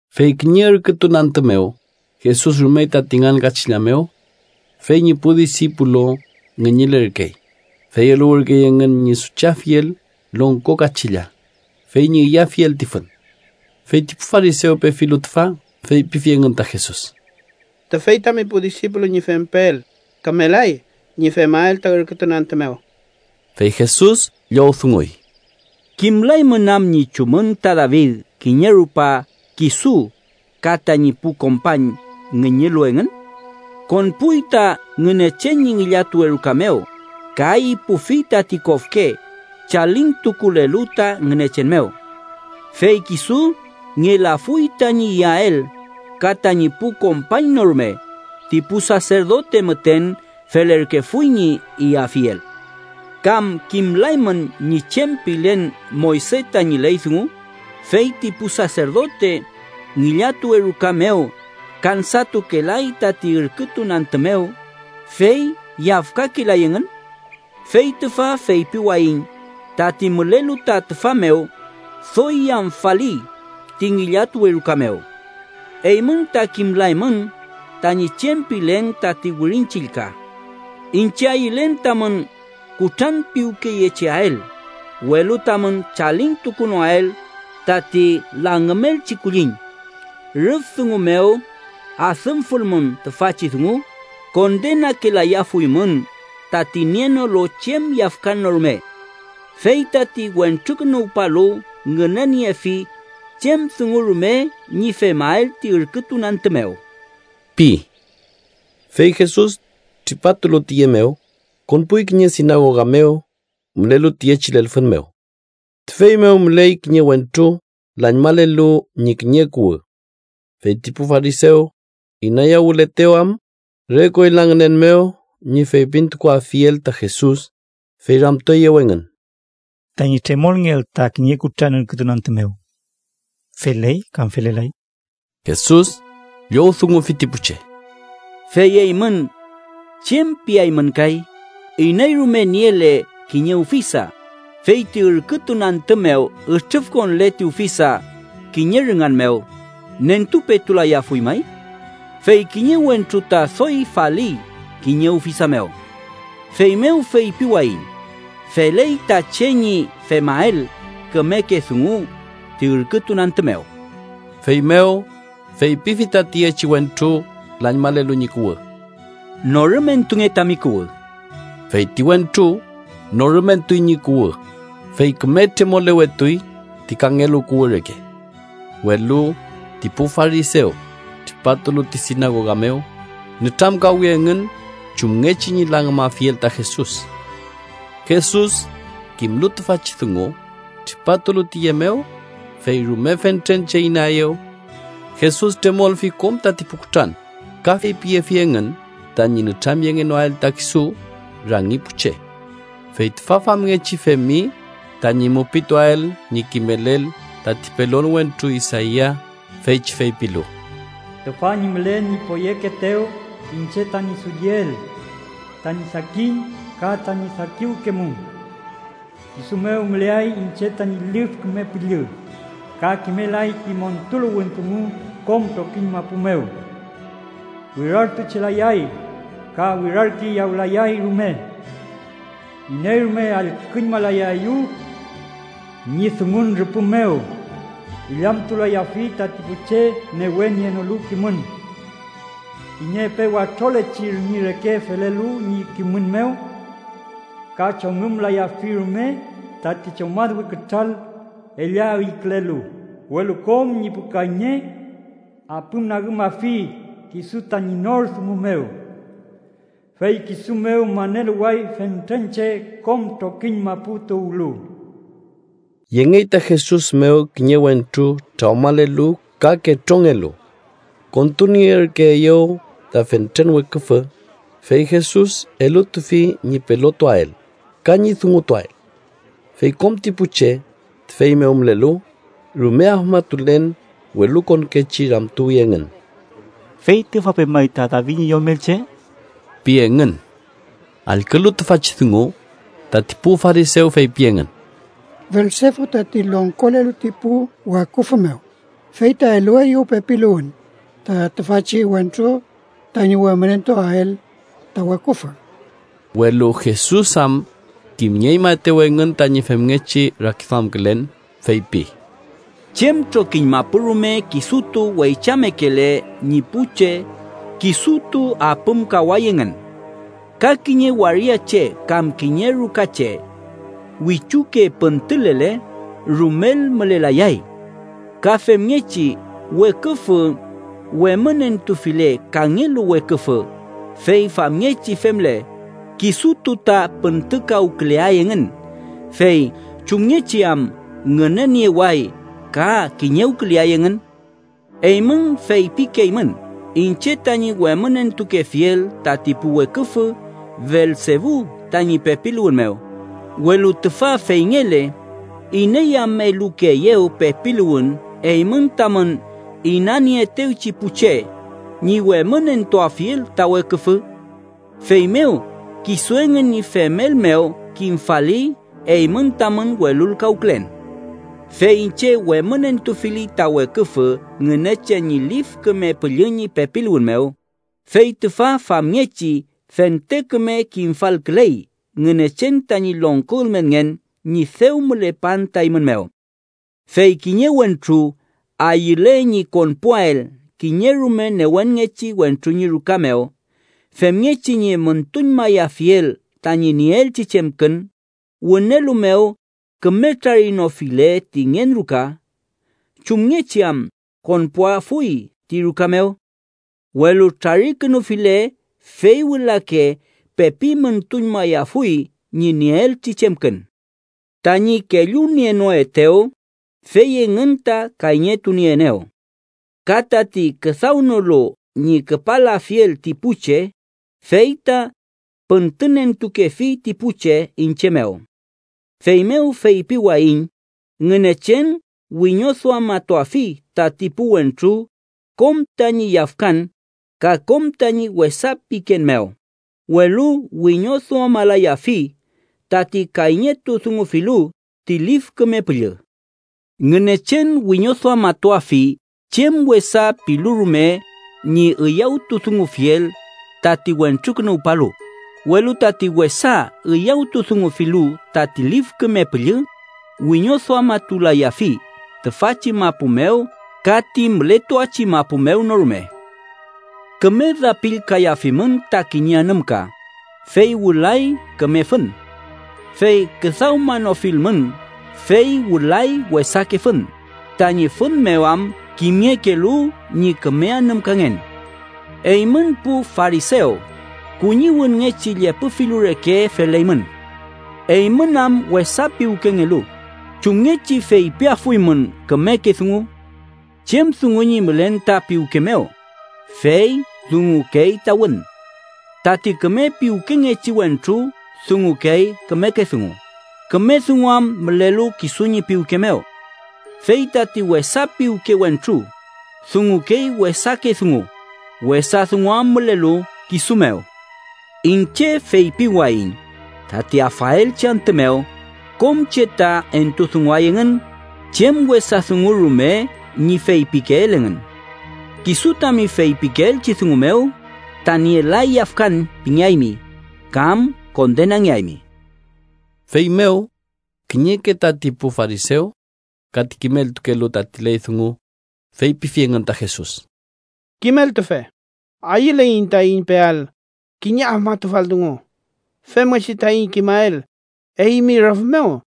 Fey kiñe ürkütun antü mew, Jesus rumey tati ngan kachilla mew. Fey ñi pu disipulu ngüñülerkey, fey eluwürkey engün ñi suchetuafiel longko kachilla, fey ñi iyafiel ti fün. Fey ti pu farisew pefilu tüfa, feypifi engün ta Jesus: —Tüfey tami pu disipulu ñi fempeel kümelay ñi femael ta ürkütun antü mew. Fey Jesus llowdunguy: —¿Kimlaymün am ñi chumün ta David kiñe rupa kisu ka tañi pu kompañ ngüñülu engün? Konpuy ta Ngünechen ñi ngillatuwe ruka mew ka ipufi tati kofke chalintukulelu ta Ngünechen mew. Fey kisu ngelafuy tañi iyael ka tañi pu kompañ no rume, ti pu saserdote müten felerkefuy ñi iyafiel. ¿Kam kimlaymün ñi chem pilen Moyse tañi ley dungu feyti pu saserdote ngillatuwe ruka mew kansatukelay tati ürkütun antü mew, fey yafkakelay engün? Fey tüfa feypiwayiñ tati mülelu ta tüfa mew doy yamfali ti ngillatuwe ruka mew. Eymün ta kimlaymün tañi chem pilen tati Wirin Chillka: ‘Iñche ayülen tamün kutranpiwkeyecheael, welu tamün chalintukunoael tati langümelchi kulliñ.’ Rüf dungu mew adümfulmün tüfachi dungu, kondenakelayafuymün tati nienolu chem yafkan no rume. Fey tati Wentrukünuwpalu ngüneniefi chem dungu rume ñi femael ti ürkütun antü mew ―pi. Fey Jesus tripatulu tiye mew, konpuy kiñe sinagoga mew mülelu tiyechi lelfün mew. Tüfey mew müley kiñe wentru lañmalelu ñi kiñe kuwü. Fey ti pu farisew inayawületew am re koyla ngünen mew ñi feypintukuafiel ta Jesus, fey ramtueyew engün: —Tañi tremolngeael ta kiñe kutran ürkütun antü mew, ¿feley kam felelay? Jesus llowdungufi ti pu che: —¿Fey eymün chem piaymün kay? Iney rume niele kiñe ufisa, fey ti ürkütun antü mew ütrüfkonle ti ufisa kiñe rüngan mew, ¿nentupetulayafuy may? Fey ¡kiñe wentru ta doy faliy kiñe ufisa mew! Feymew feypiwayiñ: feley ta che ñi femael kümeke dungu ti ürkütun antü mew. Feymew feypifi ta tiyechi wentru lañmalelu ñi kuwü: —Norümentunge tami kuwü. Fey ti wentru norümentuy ñi kuwü, fey küme tremolewetuy ti kangelu kuwü reke. Welu ti pu farisew tripatulu ti sinagoga mew, nütramkawi engün chumngechi ñi langümafiel ta Jesus. Jesus, kimlu tüfachi dungu, tripatulu tiye mew, fey rume fentren che inaeyew. Jesus tremolfi kom tati pu kutran ka feypiyefi engün tañi nütramyengenoael ta kisu rangi pu che. Fey tüfa famngechi femi tañi mupituael ñi kimelel tati pelon wentru Isaia, feychi feypilu: “Tüfa ñi mülen ñi poyekeetew, iñche tañi dulliel, tañi sakin, ka tañi sakiwkemum. Kisu mew müleay iñche tañi Lif Küme Püllü, ka kimelay ti montuluwün dungu kom trokiñ mapu mew. Wirartuchelayay ka wirarkiyawlayay rume. Iney rume allküñmalayaeyew ñi dungun rüpü mew. Illamtulayafi tati pu che newe nienolu kimün kiñe epe watrolechi rüngi reke felelu ñi kimün mew, ka chongümlayafi rume tati chomadwe kütral ella üykülelu, welu kom ñi pu kayñe apümnagümafi kisu tañi nor dungu mew. Fey kisu mew maneluway fentren che kom trokiñ mapu tuwlu.” Yengey ta Jesus mew kiñe wentru trawmalelu ka ketrongelu. Kontunierkeeyew ta fentren weküfü, fey Jesus elutufi ñi pelotuael ka ñi dungutuael. Fey kom ti pu che tüfey mew mülelu, rume afmatulen welukonkechi ramtuwi engün: “¿Fey tüfa pemay ta David ñi Yomelche?” pi engün. Allkülu tüfachi dungu, tati pu farisew feypi engün: “Belsebu, tati longkolelu ti pu weküfü mew, fey ta elueyew pepiluwün ta tüfachi wentru tañi wemünentuael ta weküfü.” Welu Jesus am kimnieñmaetew engün tañi femngechi rakiduamkülen, feypi: “Chem trokiñ mapu rume kisutu weychamekele ñi pu che, kisutu apümkaway engün. Ka kiñe waria che kam kiñe ruka che wichuke püntülele, rumel mülelayay. Ka femngechi, weküfü wemünentufile kangelu weküfü, fey famngechi femle, kisutu ta püntükawküleay engün. Fey ¿chumngechi am ngünenieway ka kiñewküleay engün? Eymün feypikeymün iñche tañi wemünentukefiel tati pu weküfü Belsebu tañi pepiluwün mew, welu tüfa feyngele, ¿iney am elukeeyew pepiluwün eymün tamün inanieetewchi pu che ñi wemünentuafiel ta weküfü? Feymew, kisu engün ñi femel mew kimfali eymün tamün welulkawkülen. Fey iñche wemünentufili ta weküfü Ngünechen ñi Lif Küme Püllü ñi pepiluwün mew, fey tüfa famngechi fente küme kimfalküley Ngünechen tañi longko ülmenngen ñi dew mülepan ta eymün mew. “Fey kiñe wentru ayüle ñi konpuael kiñe rume newenngechi wentru ñi ruka mew femngechi ñi müntuñmayafiel tañi nieelchi chemkün, wünelu mew küme trarinofile ti ngen ruka, ¿chumngechi am konpuafuy ti ruka mew? Welu trarikünufile, fey wülake pepi müntuñmayafuy ñi nieelchi chemkün. “Tañi kellunienoetew, fey engün ta kayñetunieenew. Ka tati küdawnolu ñi küpalafiel ti pu che, fey ta püntünentukefi ti pu che iñche mew. Feymew feypiwayiñ Ngünechen wiñoduamatuafi tati pu wentru kom tañi yafkan ka kom tañi wesa piken mew, welu wiñoduamalayafi tati kayñetudungufilu ti Lif Küme Püllü. Ngünechen wiñoduamatuafi chem wesa pilu rume ñi üyawtudungufiel tati Wentrukünuwpalu, welu tati wesa üyawtudungufilu tati Lif Küme Püllü, wiñoduamatulayafi tüfachi mapu mew ka ti mületuachi mapu mew no rume. “Küme dapillkayafimün ta kiñe anümka, fey wülay küme fün. Fey küdawmanofilmün, fey wülay wesake fün, tañi fün mew am kimngekelu ñi küme anümkangen. ¡Eymün pu farisew, kuñiwünngechi llepü filu reke feleymün! Eymün am wesa piwkengelu, ¿chumngechi feypiafuymün kümeke dungu? Chem dungu ñi mülen ta piwke mew, fey dungukey ta wün. Tati küme piwkengechi wentru dungukey kümeke dungu, küme dungu am mülelu kisu ñi piwke mew. Fey tati wesa piwke wentru dungukey wesake dungu, wesa dungu am mülelu kisu mew. Iñche feypiwayiñ tati afaelchi antü mew, kom che ta entudunguay engün chem wesa dungu rume ñi feypikeel engün. Kisu tami feypikeelchi dungu mew ta nielay yafkan pingeaymi, kam kondenangeaymi.” Feymew kiñeke tati pu farisew ka ti kimeltukelu tati ley dungu, feypifi engün ta Jesus: —Kimeltufe, ayüleiñ taiñ peael kiñe afmatufal dungu femngechi taiñ kimael eymi rüf mew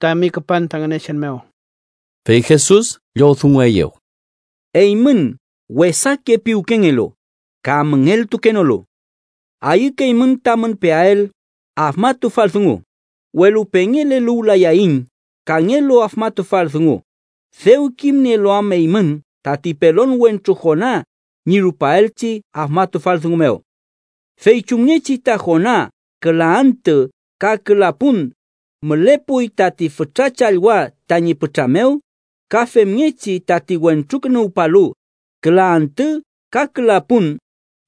tami küpan ta Ngünechen mew. Fey Jesus llowdungueyew: —Eymün wesake piwkengelu ka müngeltukenolu. Ayükeymün tamün peael afmatufal dungu, welu pengeleluwlayayiñ kangelu afmatufal dungu, dew kimnielu am eymün tati pelon wentru Jona ñi rupaelchi afmatufal dungu mew. Fey chumngechi ta Jona küla antü ka küla pun mülepuy tati fütra challwa tañi pütra mew, ka femngechi tati Wentrukünuwpalu küla antü ka küla pun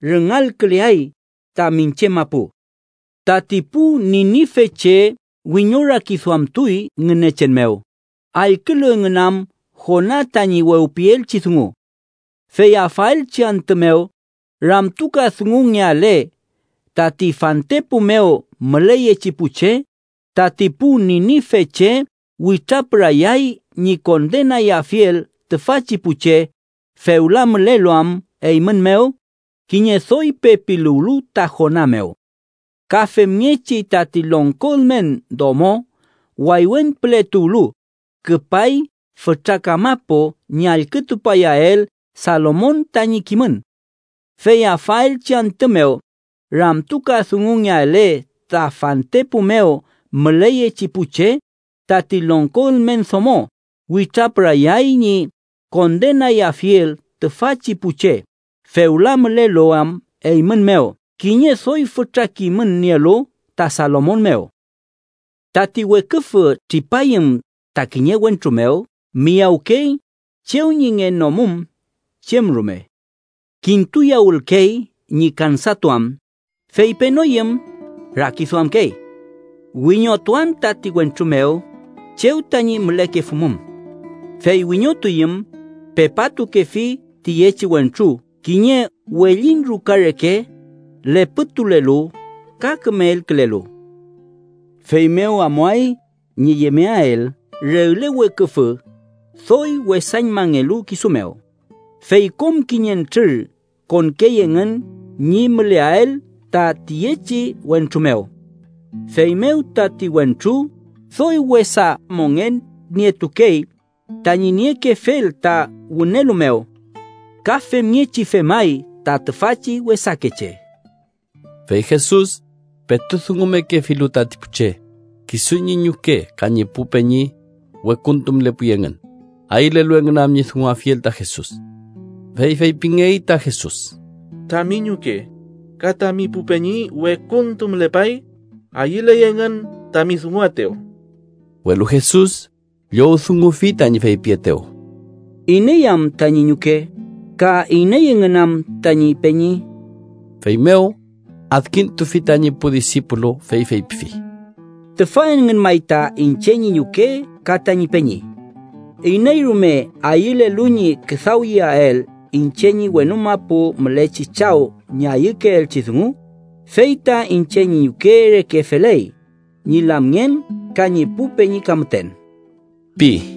rüngalküleay ta miñche mapu. Tati pu Ninifeche wiñorakiduamtuy Ngünechen mew, allkülu engün am Jona tañi wewpielchi dungu. Fey afaelchi antü mew, ramtukadungungeale tati fantepu mew müleyechi pu che, tati pu Ninifeche witrapürayay ñi kondenayafiel tüfachi pu che, fewla mülelu am eymün mew kiñe doy pepiluwlu ta Jona mew. Ka femngechi tati longko ülmen domo waywen püle tuwlu, küpay fütra kamapu ñi allkütupayael Salomon tañi kimün. Fey afaelchi antü mew, ramtukadungungeale ta fantepu mew müleyechi pu che, tati longko ülmen domo witrapürayay ñi kondenayafiel tüfachi pu che, fewla mülelu am eymün mew kiñe doy fütra kimün nielu ta Salomon mew. “Tati weküfü tripayüm ta kiñe wentru mew, miyawkey chew ñi ngenomum chem rume. Kintuyawülkey ñi kansatuam, fey penoyüm, rakiduamkey: ‘Wiñotuan tati wentru mew chew tañi mülekefumum.’ Fey wiñotuyüm, pepatukefi tiyechi wentru kiñe wellin ruka reke, lepütulelu ka küme elkülelu. Feymew amuay ñi yemeael regle weküfü doy wesañmangelu kisu mew, fey kom kiñentrür konkey engün ñi müleael ta tiyechi wentru mew. Feymew tati wentru doy wesa mongen nietukey tañi niekefel ta wünelu mew. Ka femngechi femay ta tüfachi wesakeche.” Fey Jesus petu dungumekefilu tati pu che, kisu ñi ñuke ka ñi pu peñi wekuntu mülepuy engün, ayülelu engün am ñi dunguafiel ta Jesus. Fey feypingey ta Jesus: —Tami ñuke ka tami pu peñi wekuntu mülepay. Ayüley engün tami dunguaetew. Welu Jesus llowdungufi tañi feypietew: —¿Iney am tañi ñuke, ka iney engün am tañi peñi? Feymew, adkintufi tañi pu disipulu, fey feypifi: —Tüfa engün may ta iñche ñi ñuke ka tañi peñi. Iney rume ayülelu ñi küdawyeael iñche ñi wenu mapu mülechi Chaw ñi ayükeelchi dungu, fey ta iñche ñi ñuke reke feley, ñi lamngen ka ñi pu peñi ka müten ―pi.